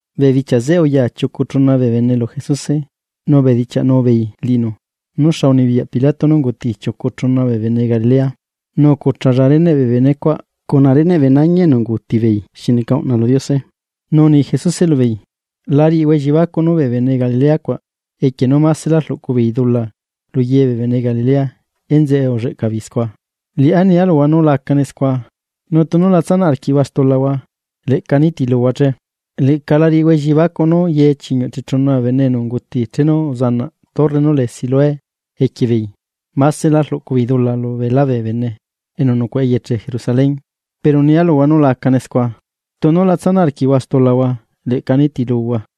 Bee bichia zeꞌe, uya chiucu chuna bee bene lu Jesuse, nu ubedichiaꞌnu beei liꞌinu nú xa unibiyaꞌ Pilato nú unguti chiucu chuna bee bene Galilea, nu ucuchalla reneꞌ bee benecuaꞌ cuna reneꞌ bee nañi enu unguti beei xi neca uꞌna lu Diose. Nu uni Jesuse lubeei: ―La riꞌihua elliebacuꞌ nú bee bene Galilea cuaꞌ, equie nú másela rluꞌcu beei dula lu ye bee bene Galilea enzeꞌe ulleꞌca beei scua. Liꞌá nia luhua nú la acane scua, nu tunu la tsanaꞌ arquiꞌhua stulahua, leꞌca nitiluhua che. Leꞌca la riꞌihua elliebacuꞌ nú ye chiñuꞌ chechuna bee bene enu unguti chenu uzanaꞌ torre nú lee Siloé equie beei, másela rluꞌcu beei dula lubeelá bee bene enu nucuaꞌa eyeche Jerusalén. Pero nia luhua nú la acane scua. Tunu la tsanaꞌ arquiꞌhua stulahua leꞌca nitiluhua.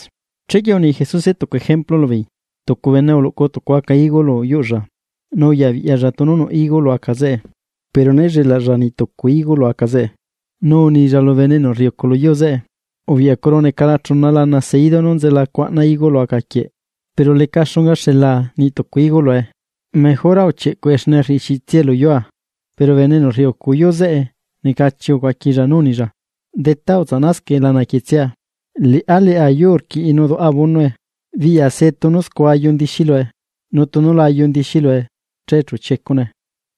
Chequie uni Jesuse tucu ejemplu lubeei: ―Tucu bene uluꞌcu tucu aca higo lu yuꞌlla, nu uyabiꞌyalla tunu nuꞌ higo lu aca zeꞌe, pero né llelaꞌlla niꞌ tucu higo lu aca zeꞌe. Nu unilla lu bene enu rriucu lu yuu zeꞌe: “Ubiꞌyacuru necala chuna lana seidu nú nzela cuaꞌna higo lu aca quieꞌ, pero leca xunga xela niꞌ tucu higo lue. Mejora uchieꞌcuꞌe xne rriꞌixiꞌitsiae lu yua.” Pero bene enu rriucu yuu zeꞌe necachi ucuaquilla nú unilla: “Detá, utsaꞌnascaꞌe lana quietsia, liꞌá leꞌa yuu rquiꞌi nu duꞌa abonoe, biꞌya se tunu scua ayu ndixí lue, nu tunu la ayu ndixí lue, che chu chiecune.”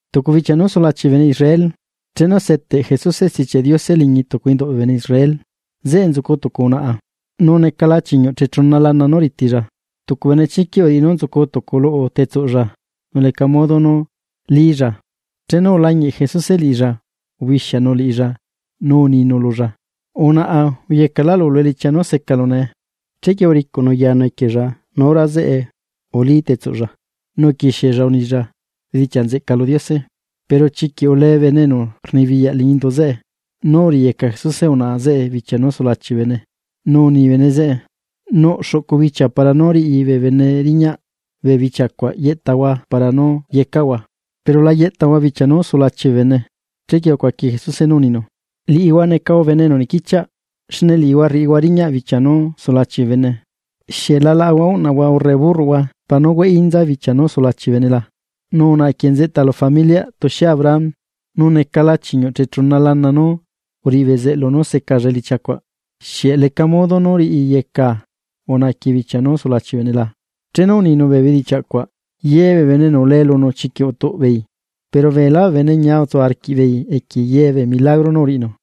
Tucu bichia nú sulachi bee bene Israel, chenu seteꞌ Jesuse Stichiaꞌ Diose liñi tucu induꞌ bee bene Israel, zeꞌe nzucu tucu unaꞌa, nu necala chiñuꞌchechuna lana nú ritilla. Tucu benechiquiꞌ uriꞌi nú nzucu tucu luꞌu tetsuꞌlla nu leca modo nú lílla. Chenu ulañiꞌ Jesuse liꞌilla ubixianu liꞌilla nu uninu lulla: ―Unaꞌa, uyecaꞌlaꞌlu lu elichia nú secalu nee. Chequie uricuꞌnu yanu equiella nu hora zeꞌe ulí tetsuꞌlla, nu uquixiella unilla bedichiaꞌ nzeꞌca lu Diose. Pero chiquiꞌ ulee bene enu rnibiyaꞌ liñi indu zeꞌe, nú uriꞌiyeca Jesuse unaꞌa zeꞌe bichia nú sulachi bee bene, nu uni bene zeꞌe: ―Nuꞌ xuꞌcu bichia para nú riꞌi bee bene riñaꞌ, bee bichia cuaꞌ yeꞌtahua para nú yecaꞌhua, pero la yeꞌtahua bichia nú sulachi bee bene. Chequie ucuaqui Jesuse nú uninu: ―Liꞌihua necahua bene enu nequichiaꞌ, xne liꞌihua rriꞌihua riñaꞌ bichia nú sulachi bee bene. ¿Xieꞌ la laꞌahua uꞌnahua, urre burroꞌhua para nú hueꞌí inza bichia nú sulachi bee bene la? Nu unaꞌa quieꞌ nzeꞌta lu familiꞌ tuxie Abraham, nu necala chiñuꞌ chechuna lana nú uriꞌi bezeꞌlu nú secalla elichia cuaꞌ, ¿xieꞌ leca modo nú riꞌiyecaa unaꞌa quieꞌ bichia nú sulachi bee bene la? Chenu uninu bee bedichiaꞌ cuaꞌ, ye bee bene enu ulee lunu chiquiꞌ utuꞌ beei. Pero beelá bee bene ñia utsu arquiꞌbeei equie ye bee milagro nú uriꞌinu.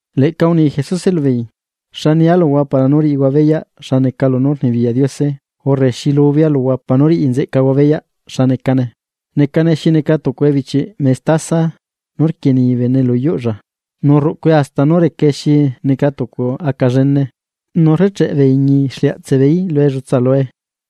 Leꞌca uni Jesuse lubeei: ―¿Xa nia luhua para nú riꞌihua beyaꞌ xa neca lunú rnibiyaꞌ Diose urre xi lubea luhua para nú riꞌi nzeꞌcahua beyaꞌ xa necane? Necane xi neca tucu ebichiꞌ mestaza nú rquienii bene lu yuꞌlla, nu rruꞌcue hasta nú recae xi neca tucu aca llene, nu rrecheꞌe bee iñi exliaꞌtseꞌ beeí lu ellutsa lue.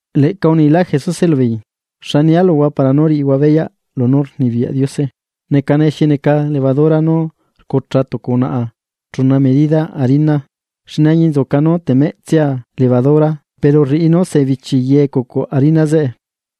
Leꞌca unilá Jesuse lubeei: ―¿Xa nia luhua para nú riꞌihua beya lunú rnibiyaꞌ Diose? Necane xi neca levadura nú rcucha tucu unaꞌa chuna medida harina, xne añinzuca nú temeꞌtsia levadura pero rriꞌi nú sebichi ye ecucu harina zeꞌe.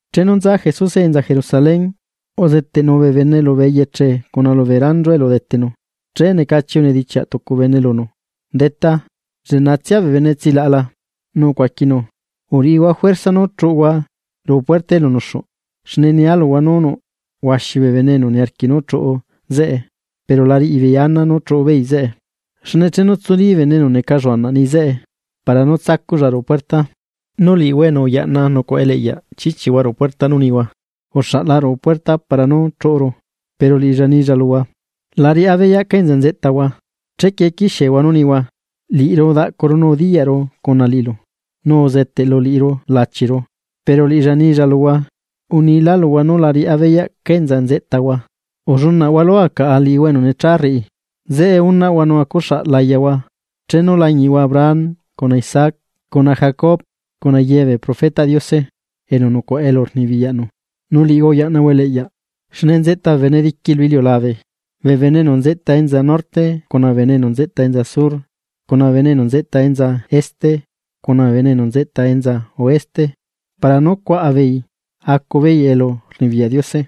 Chenu nza Jesuse enza Jerusalén, uzeteꞌnu bee bene lubee eyeche cuna lubee ranchu elu udetenu. Che necachi unedichiaꞌ tucu bene lunu: ―¿Detá, lleꞌnatsia bee bene enu tsilaꞌa la? Nu ucuaquinu: ―Uriꞌihua juerza nú chuꞌuhua ruꞌu puerta elu nuxuꞌ, xne nia luhua nú nuꞌ huaxi bee bene enu niarquiꞌ nú chuꞌu zeꞌe, pero la riꞌi beei ana nú chuꞌu beei zeꞌe. Xne chenu tsulí bene enu neca lluanaꞌ niꞌi zeꞌe para nú tsacuꞌlla ruꞌu puerta, nu liꞌihua enu uyaꞌna nucuaꞌa eliꞌyaꞌ chichihua ruꞌu puerta nu nihua: “Uxaꞌla ruꞌu puerta para nú chuꞌuru.” Pero liꞌilla nilla luhua: “La riꞌá beyaꞌ cá enza nzeꞌtahua.” Chequie quixiehua nú nihua: “Liꞌiru udaꞌcuru nu udiyaꞌru cuna liꞌilu, nu uzeteꞌlu liꞌiru lachiru.” Pero liꞌilla nilla luhua: “Unilá luhua nú la riꞌá beyaꞌ ca enza nzeꞌtahua. ¡Ullunaꞌhua lua caꞌa liꞌihua enu necha rriꞌi!” Zeꞌe unaꞌhua nu acuxaꞌ layahua, chenu lañiꞌhua Abraham, cuna Isaac, cuna Jacob cuna ye bee profetaꞌ Diose enu nucuaꞌa elu rnibiyaꞌnu, nu liꞌihua uyaꞌnahua eliꞌyaꞌ. Xne nzeꞌta bee bene diqui lu iliulabe, bee bene enu nzeꞌta enza norte, cuna bee bene enu nzeꞌta enza sur, cuna bee bene enu nzeꞌta enza este, cuna bee bene enu nzeꞌta enza oeste, para nú cuaꞌa beei acu beei elurnibiyaꞌ Diose.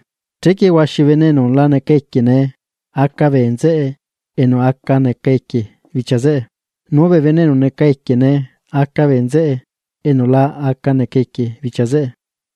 Chequie huaxi bee bene enu la neca equie nee, aca bee nzeꞌe enu aca neca equie bichia zeꞌe, nu bee enu neca equie nee, aca bee nzeꞌe enu la aca neca equie bichia zeꞌe.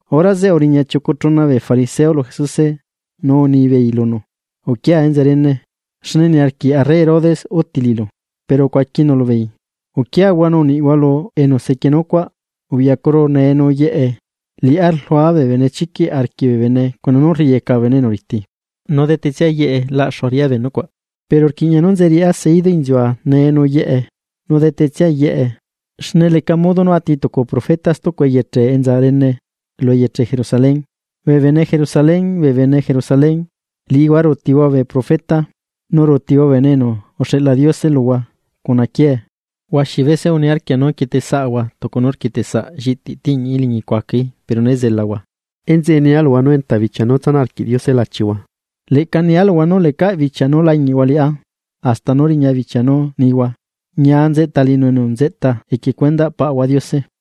Hora zeꞌe uriña chiucu chuna bee fariseo lu Jesuse nu unibeei lunu: ―Uquia enza rene, xne niarquiꞌ arre Herodes uti liꞌilu. Pero ucuaquinu lubeei: ―Uquiahua nu uniꞌhua lu enu sequienu cuaꞌ: “Ubiꞌyacuru nee nu yeꞌe, liꞌá rlua bee benechiquiꞌ arquiꞌ bee bene cuna nú rriꞌiyeca bee bene enu riti, nu detetsia yeꞌe laꞌxua.” Pero rquiꞌña nú nze riꞌá seidu inziua nee nu yeꞌe nu detetsia yeꞌe, xne leca modo nú ati tucu profeta stucu eyeche enza rene lu eyeche Jerusalén. ’Bee bene Jerusalén, bee bene Jerusalén, liꞌihua ruutihua bee profeta, nu rduꞌhua quiee bee Bene enu uxeꞌla Diose luhua. Huaxi bese uniarquia nú quietesaꞌahua tucu nú rquieteꞌsaꞌ lliꞌti tiꞌñiꞌí liñi cuacaí pero né zelahua. Enzeꞌe nia luhua nú enta bichia nú tsanaꞌ arquiꞌ Diose lachihua. Leꞌca nia luhua nú lecaꞌ bichia nú lañiꞌhua liꞌá, hasta nú riña bichia nú nihua. Ñia nzeꞌta liꞌinu enu nzeꞌta equie cuendaꞌ Paꞌahua Diose.